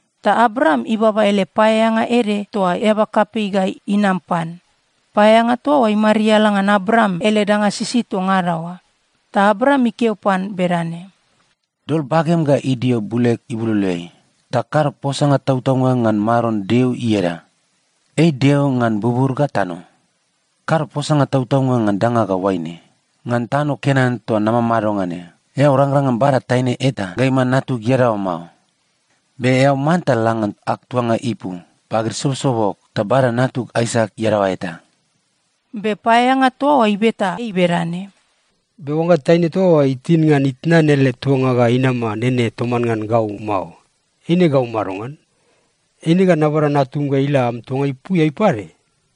Ta Abraam ibaba ele paeaeanga ede toa eaba kapei ga inam pan. Paeaeanga toa oa imariala ngan Abraam ele danga sisid toa ngada oa. Ta Abraam ikeo pan bedane, “Dol bagem ga idio buleg ibuloloeai, ta kado posanga tautaunga ngan Maron Deo ieda. Ei Deo ngan bubur ga tano. Kado posanga tautaunga ngan danga ga oaine. Ngan tano Kenan toa namamado ngan ne, eao rangrang ngan bada taine eta ga iman natug iadaoa mao. Be eao manta la ngan ag tuanga ipu pagid sobosobog ta bada natug Aisak iadaoa eta.” Be paeaeanga toa oa ibeta ei bedane, “Be oangga taine toa oa itin ngan itnan ele tuanga ga inama nene toman ngan gau mao, eine gau madongan? Eine ga nabada natum ga ila am tuanga ipuiai pade?”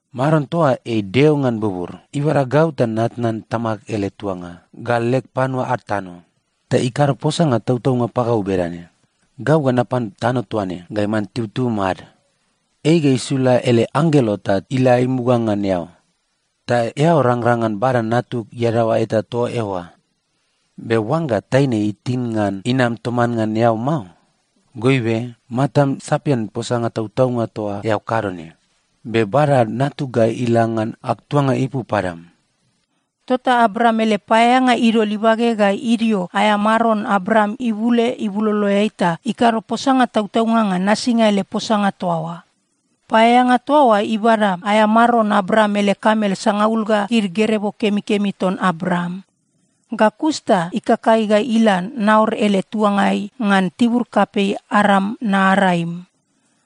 Maron toa ei Deo ngan bubur, ibada gau ta natnan tamag ele tuanga ga leg panua ad tano, ta ikado posanga tautaunga pagau bedane, ‘Gau ga napan tano toa ne ga iman tibutibum ad.’ Ei ga isula ele anggelo ta ila imuga ngan eao, ta eao rangrang ngan bada natug iadaoa eta toa eoa. Be oangga taine itin ngan inam toman ngan eao mao, goibe, matam sapian posanga tautaunga toa eao kado ne. Be bada natug ga ila ngan ag tuanga ipu padam.” Tota Abraam ele paeaeanga idol ibage ga idio aea maron Abraam ibule ibuloloeai ta ikado posanga tautaunga ngan nasinga ele posanga toa oa. Paeaeanga toa oa ibada aea maron Abraam ele kamel sangaul ga gid gerebo kemikemi ton Abraam, ga kus ta ikakai ga ila Naor ele tuangai ngan tibur kapei Aram-Naaraim.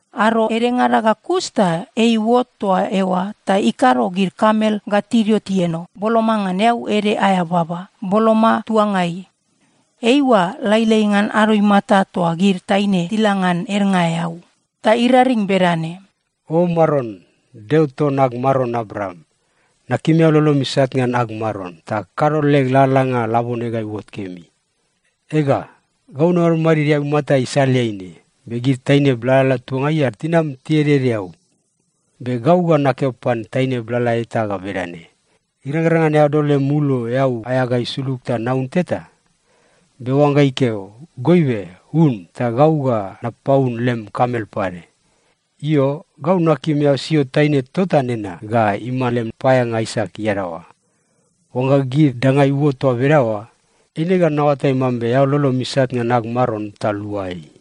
Ado edengada ga kus ta ei iuot toa eoa ta ikado gid kamel ga tidio tieno boloma ngan eau ede aea baba, boloma tuangai. Eiua lailai ngan ado imata toa gid taine tila ngan ednga eau. Ta iraring bedane, “O Maron, Deo ton ag maron Abraam, nakim eao lolom isat ngan ag maron, ta kado leg lalalanga labone ga iuot kemi. Ega, gau namadmadid eaumata isaleai ne, be gid taine blalala tuangai ad tinam tieded eau. Be gau ga nakeo pan taine blala eta ga bedane, ‘Irangrang ngan eao dol lem ulo eau aea ga isulug ta naun teta?’ Be oangga ikeo, ‘Goibe, un, ta gau ga napaun lem kamel pade.’ Io, gau nakim eao sio taine tota nena ga iman lem paeaeanga Aisak iadaoa. Oangga gid danga iuot toa bedaoa, eine ga naoatai mambe eao lolom isat ngan ag maron ta lua ei.”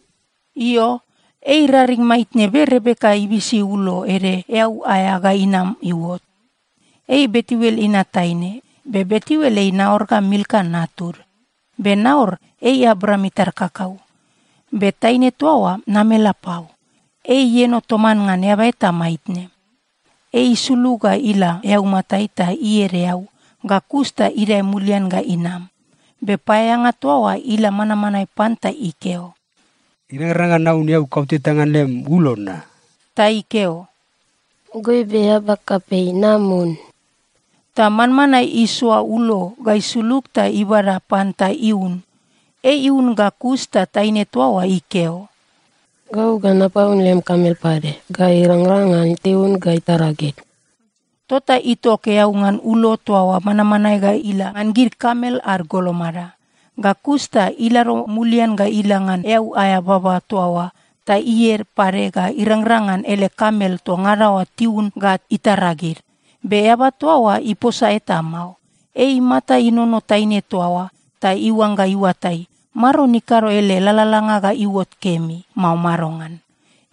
Io, ei iraring maitne, be Rebeka ibisi ulo ede eau aea ga inam iuot. Ei Betuel inat taine. Be Betuel ei Naor ga Milka natud. Be Naor ei Abraam itar kakau. Be taine toa oa namelapau. Ei ieno toman ngan eaba eta maitne. Ei isulug ga ila eaumatai ta ied eau, ga kus ta idae mulian ga inam. Be paeaeanga toa oa ila manmanae pan ta ikeo, “Irangrang ngan naun eau kauteta ngan lem ulo na?” Ta ikeo, “Goibe eaba kapei, nam un.” Ta manmanae isoa ulo ga isulug ta ibada pan ta iun. Ei iun ga kus ta taine toa oa ikeo, “Gau ga napaun lem kamel pade, ga irangrang ngan tiun ga itara gid.” Tota itok eau ngan ulo toa oa manmanae ga ila ngan gid kamel ad golomada. Ga kus ta ilado mulian ga ila ngan eau aea baba toa oa ta ied pade ga irangrang ngan ele kamel toa ngada oa tiun ga itara gid. Be eaba toa oa iposa eta mao. Ei imata inono taine toa oa ta iuangga iuatai, Maron ikado ele lalalanga ga iuot kemi, mao madongan.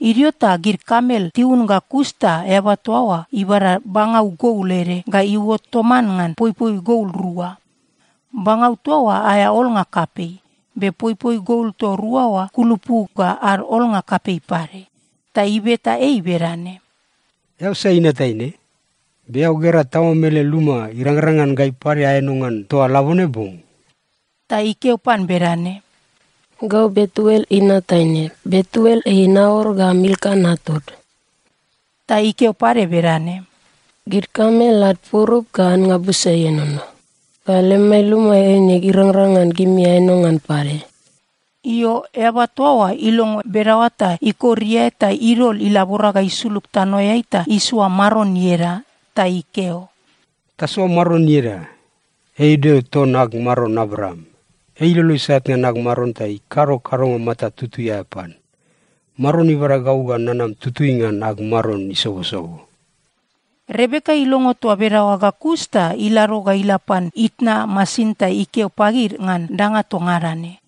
Idio ta gid kamel tiun ga kus ta eaba toa oa ibada bangau gol ede ga iuot toman ngan poipoi gol rua. Bangau toa oa aea olnga kapei, be poipoi gol toa rua oa kulupu ga ad olnga kapei pade. Ta ibeta ei bedane, “Eao sai inat taine? Be eao gera tamam ele luma irangrang ngan gai pade aeno ngan toa labone bong?” Ta ikeo pan bedane, “Gau Betuel inat taine. Betuel ei Naor ga Milka natud.” Ta ikeo pade bedane, “Gid kamel ad purup ga annga busa ienono, ga lemai luma eine irangrang ngan gimi aeno ngan pade.” Io, eaba toa oa ilongo bedaoa ta ikor iae ta idol ilabora ga isulug tanoeai ta isoa Maron ieda. Ta ikeo, “Tasoa Maron ieda. Ei Deo ton ag maron Abraam. Ei ilolo isat ngan ag maron ta ikado kadonga mata tutui aea pan. Maron ibada gau ga nanam tutui ngan ag maron isobosobo!” Rebeka ilongo toa bedaoa ga kus ta ilado ga ila pan itna masin ta ikeo pagid ngan danga toa ngada ne.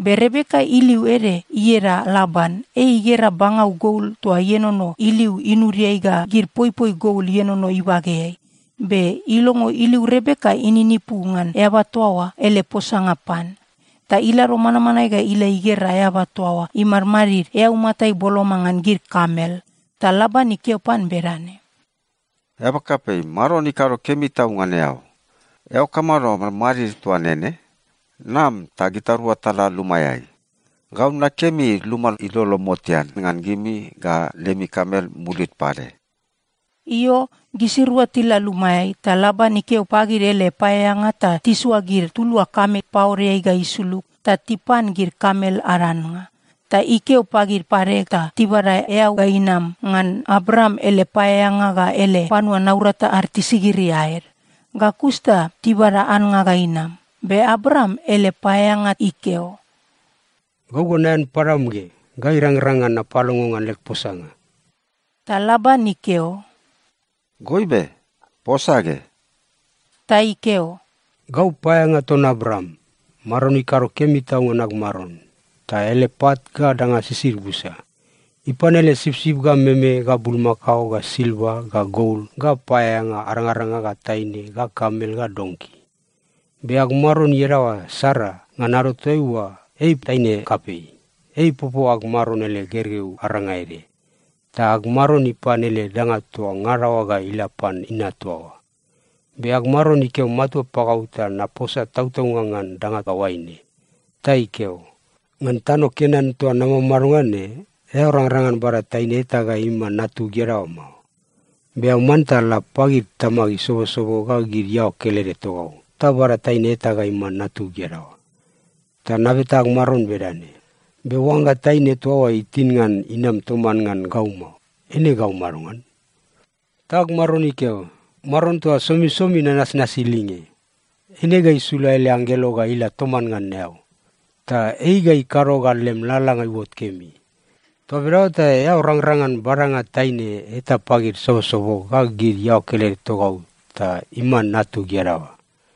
Be Rebeka iliu ede ieda Laban. Ei igera bangau gol toa ienono iliu inudiai ga gid poipoi gol ienono ibageai, be ilongo iliu Rebeka ininipu ngan eaba toa oa ele posanga pan. Ta ilado manmanae ga ila igera eaba toa oa imadmadid eaumatai boloma ngan gid kamel. Ta Laban ikeo pan bedane, “Eaba kapei, Maron ikado kemi tau ngan eao. Eao kamado madmadid toa nene? Nam ta gitarua tala lumaeai. Gau nakemi luma ilolo motean ngan gimi, ga lemi kamel mulid pade.” Io, gisirua tila lumaeai, ta Laban ikeo pagid ele paeaeanga ta tisoa gid tulua kamel paodeai ga isulug ta tipan gid kamel ad annga. Ta ikeo pagid pade ta tibada eau ga inam ngan Abraam ele paeaeanga ga ele panua naurata ad tisigiri aed. Ga kus ta tibada annga ga inam, be Abraam ele paeaeanga ikeo, “Gau ga naean padam ge ga irangrang ngan napalongo ngan leg posanga.” Ta Laban ikeo, “Goibe, posa ge.” Ta ikeo, “Gau paeaeanga ton Abraam. Maron ikado kemi tau ngan ag maron, ta ele pat ga danga sisid busa. Ipan ele sipsip ga meme ga bulmakao ga silva ga gol ga paeaeanga arangaranga ga taine ga kamel ga donki. Be ag maron iadaoa Sara, ngan ado toaiua ei taine kapei, ei ipopo ag maron ele gergeu aranga ede. Ta ag maron ipan ele danga toa ngada oa ga ila pan inat toa oa. Be ag maron ikeo matua pagau ta naposa tautaunga ngan danga ga oaine. Ta ikeo, ‘Ngan tano Kenan toa namamado ngan ne, eao rangrang ngan bada taine eta ga iman natug iadaoa mao. Be eao manta la pagid tamag isobosobo ga gid iaoa kelede togau, ta bada taine eta ga iman natug iadaoa.’ “Ta nabeta ag maron bedane, ‘Be oangga taine toa oa itin ngan inam toman ngan gau mao, eine gau madongan?’ “Ta ag maron ikeo, ‘Maron toa somisomi nanasnasi ilinge, eine ga isula ele anggelo ga ila toman ngan eao. Ta ei ga ikado ga lem lalalanga iuot kemi. Toa bedaoa ta eao rangrang ngan badanga taine eta pagid sobosobog ga gid iaoa kelede togau ta iman natug iadaoa.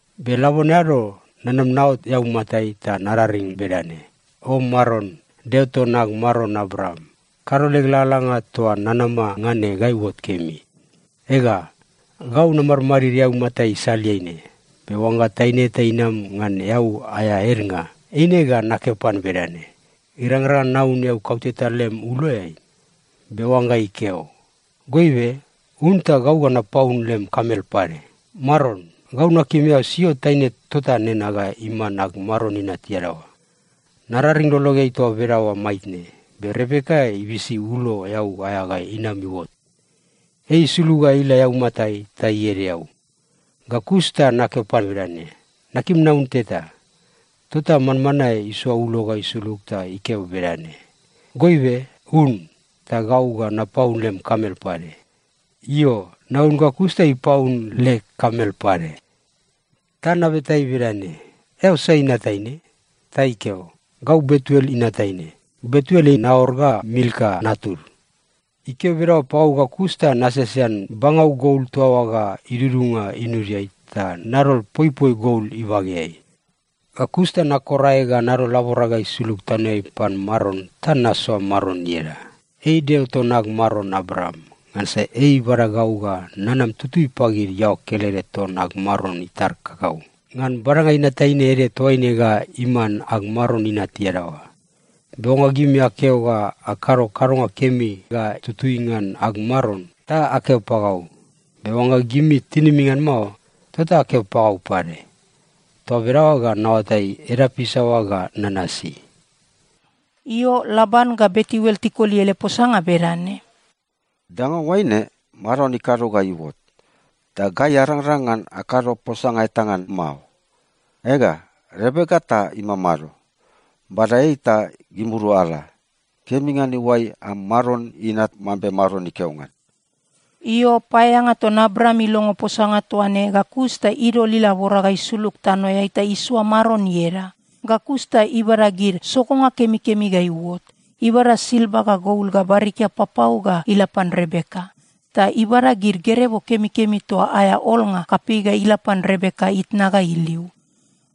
“Be labone ado, nanam naot eaumatai ta nararing bedane, ‘O Maron, Deo ton ag maron Abraam, kado leg lalalanga toa nanama ngan ne ga iuot kemi. Ega, gau namadmadid eaumata isaleai ne, be oangga taine eta inam ngan eau aea ednga, eine ga nakeo pan bedane, “Irangrang ngan naun eau kauteta lem uloeai?” Be oangga ikeo, “Goibe, un, ta gau ga napaun lem kamel pade,” Maron, gau nakim eao sio taine tota nena ga iman ag maron inat iadaoa.’ “Nararing lologeai toa bedaoa maitne, be Rebeka ibisi ulo eau aea ga inam iuot. Ei isulug ga ila eaumatai ta ied eau. Ga kus ta nakeo pan bedane, ‘Nakim naun teta.’ “Tota manmanae isoa ulo ga isulug ta ikeo bedane, ‘Goibe un, ta gau ga napaun lem kamel pade.’ Io, naun ga kus ta ipaun leg kamel pade. “Ta nabeta ei bedane, ‘Eao sai inat taine?’ “Ta ikeo, ‘Gau Betuel inat taine. Betuel ei Naor ga Milka natud.’ “Ikeo bedaoa pagau ga kus ta nasesean bangau gol toa oa ga idudunga inudiai ta nadol poipoi gol ibageai. Ga kus ta nakor aeg ga nadol laborag ga isulug tanoeai pan Maron ta nasoa Maron ieda, ei Deo ton ag maron Abraam. Ngansa ei ibada gau ga nanam tutui pagid iaoa kelede ton ag maron itar kakau, ngan badanga inat taine ede toaine ga iman ag maron inat iadaoa. Be oangga gimi akeo ga akado kadonga kemi ga tutui ngan ag maron, ta akeo pagau. Be oangga gimi tinimi ngan mao, tota akeo pagau pade. Toa bedaoa ga naoatai edap isaoa ga nanasi.” Io, Laban ga Betuel tikoli ele posanga bedane, “Danga oaine, Maron ikado ga iuot. Ta gai arangrang ngan akado posanga eta ngan mao. Ega, Rebeka ta imamado. Bada ei ta gimirua ala. Kemi ngan iuai am maron inat, mambe Maron ikeo ngan.” Io, paeaeanga ton Abraam ilongo posanga toa ne ga kus ta idol ilabora ga isulug tanoeai ta isoa Maron ieda. Ga kus ta ibada gid sogonga kemikemi ga iuot. Ibada silva ga gol ga barikia papau ga ila pan Rebeka. Ta ibada gid gerebo kemikemi toa aea olnga kapei ga ila pan Rebeka itna ga iliu.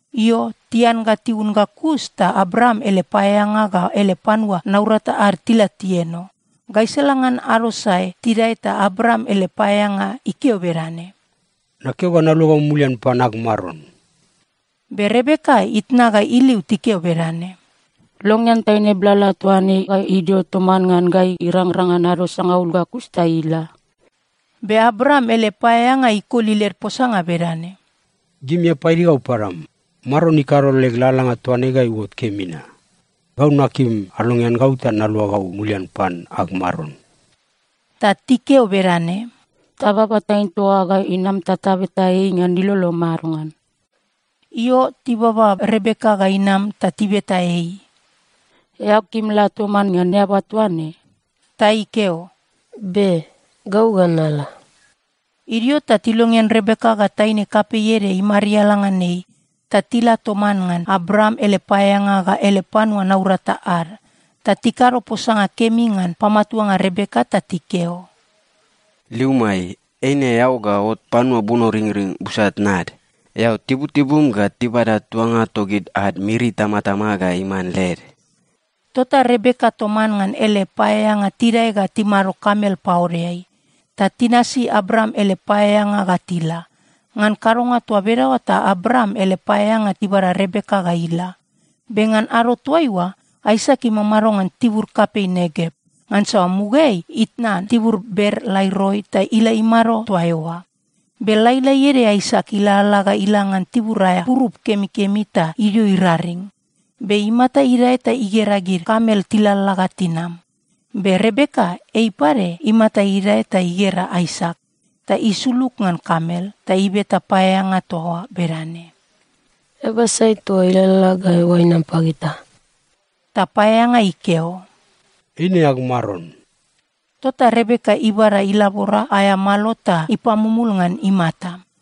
Io, tian ga tiun ga kus ta Abraam ele paeaeanga ga ele panua naurata ad tila tieno. Gaisala ngan ado sae tidae ta Abraam ele paeaeanga ikeo bedane, “Nakeo ga naluagau mulian pan ag maron.” Be Rebeka itna ga iliu tikeo bedane, “Longean taine blala toa ne ga idio toman ngan gai irangrang ngan ado sangaul, ga kus ta ila.” Be Abraam ele paeaeanga ikoli led posanga bedane, “Gimi apaidi gau padam. Maron ikado leg lalalanga toa ne ga iuot kemi na. Gau nakim alongean gau ta naluagau mulian pan ag maron.” Ta tikeo bedane, “Tababa taine toa oa ga inam ta tabeta ei ngan ilolo madongan.” Io, tibaba Rebeka ga inam ta tibeta ei, “Eao kim la toman ngan eaba toa ne?” Ta ikeo, “Be. Gau ga nala.” Idio ta tilongean Rebeka ga taine kapei ede imariala ngan ei, ta tila toman ngan Abraam ele paeaeanga ga ele panua naurata ad. Ta tikado posanga kemi ngan pamatuanga Rebeka ta tikeo, “Liumai, eine eao ga ot panua bunoringring busa tnad. Eao tibutibum ga tibada tuanga togid ad miri itamatama ga iman led.” Tota Rebeka toman ngan ele paeaeanga tidae ga timado kamel paodeai. Ta tinasi Abraam ele paeaeanga ga tila. Ngan kadonga toa bedaoa ta Abraam ele paeaeanga ibada Rebeka ga ila. Be ngan ado toaiua, Aisak imamado ngan tibur kapei Negev. (Ngansa mugaeai itnan tibur Ber-Laai-Roi ta ila imado toa eoa.) Be lailai ede Aisak ilalala ga ila ngan tibur aea purup kemikemi ta idio iraring. Be imata idae ta igera gid kamel tilalala ga tinam. Be Rebeka ei pade imata idae ta igera Aisak. Ta isulug ngan kamel ta ibeta paeaeanga toa oa bedane, “Eaba sai toa ilalala ga eoa ga inam pagita?” Ta paeaeanga ikeo, “Eine ag maron.” Tota Rebeka ibada ilabora aea malo ta ipamumul ngan imata.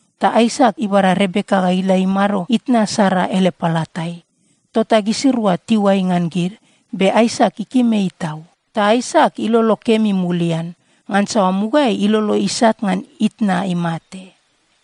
Ta Aisak ibada Rebeka ga ila imado itna Sara ele palatai. Tota gisirua tiuai ngan gid, be Aisak ikim ei tau. Ta Aisak ilolo kemi mulian. Ngansa mugaeai ilolo isat ngan itna imate.